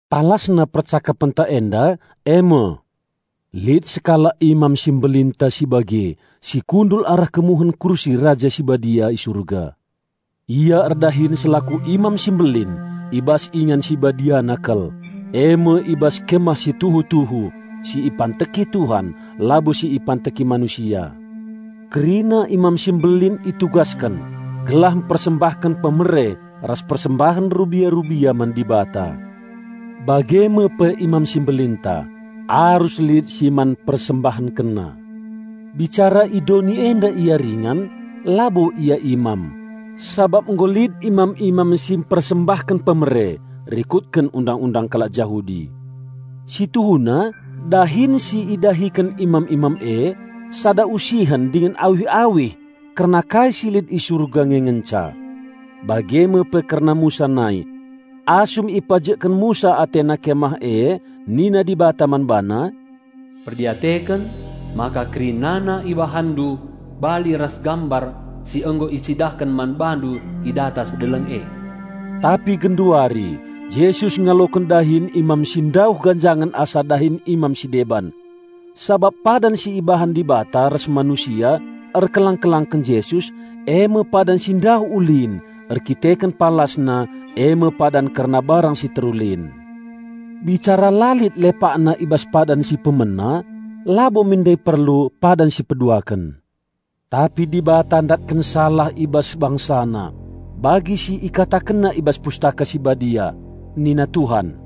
Palasna percakapenta enda e me: Lit sekalak Imam Simbelinta si bage, si kundul arah kemuhen kursi Raja Sibadia i Surga. Ia erdahin selaku Imam Simbelin i bas Ingan Sibadiana kal, e me i bas kemah si tuhu-tuhu, si ipanteki Tuhan, labo si ipanteki manusia. Kerina Imam Simbelin itugasken gelah mpersembahken pemere ras persembahen rubia-rubia man Dibata. Bage me pe Imam si Mbelinta, arus lit si man PersembahkenNa. Bicara i doni enda Ia ringan, labo Ia imam, sabap nggo lit imam-imam si mpersembahken pemere rikutken Undang-undang kalak Jahudi. Si tuhuna dahin si idahiken imam-imam e sada usihen dingen awih-awih kerna kai si lit i surga nge ngenca. Bage me pe kerna Musa nai. Asum ipajekken Musa atena Kemah e nina Dibata man bana, "Perdiateken maka kerinana ibahanndu bali ras gambar si nggo icidahken man bandu i datas deleng e." Tapi genduari, Jesus ngaloken dahin imam si ndauh ganjangen asa dahin imam si deban. Sabap padan si ibahan Dibata ras manusia erkelang-kelangken Jesus, e me padan si ndauh ulin, erkiteken palasna e me padan kerna barang si terulin. Bicara la lit lepakna i bas padan si pemena, labo min ndai perlu padan si peduaken. Tapi Dibata ndatken salah i bas BangsaNa, bagi si IkatakenNa i bas Pustaka Si Badia, "Nina Tuhan,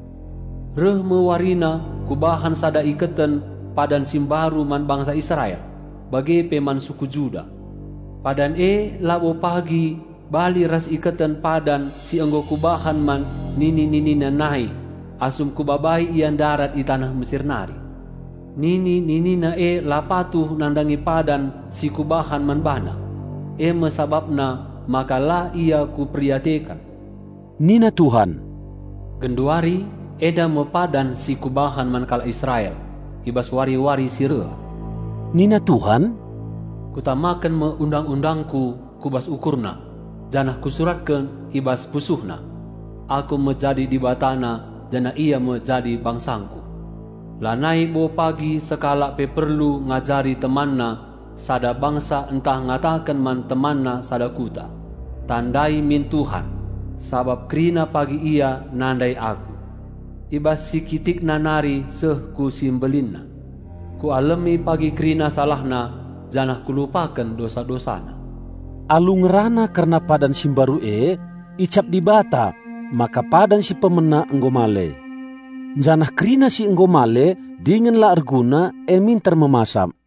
'Reh me warina Kubahan sada iketen padan si mbaru man bangsa Israel, bage pe man suku Juda.' Padan e labo pagi bali ras iketen padan si nggo Kubahan man nini-ninina nai asum Kubabai ia ndarat i taneh Mesir nari. Nini-ninina e la patuh nandangi padan si Kubahan man bana, e me sabapna maka la ia Kuperdiateken nina Tuhan. Genduari, enda me padan si Kubahan man kalak Israel i bas wari-wari si reh nina Tuhan: Kutamaken me Undang-undangKu ku bas ukurna, janah Kusuratken i bas pusuhna. Aku me jadi Dibatana janah ia me jadi bangsangKu. Lanai bo pagi sekalak pe perlu ngajari temanna sada bangsa ntah ngataken man temanna sada kuta, 'Tandai min Tuhan.' Sabap kerina pagi ia nandai Aku, i bas si kitikna nari seh ku si mbelinna. Kualemi pagi kerina salahna, janah Kulupaken dosa-dosana." Alu ngerana kerna padan si mbaru e, icap Dibata maka padan si pemena nggo male; janah kerina si nggo male dingen la erguna e minter me masap.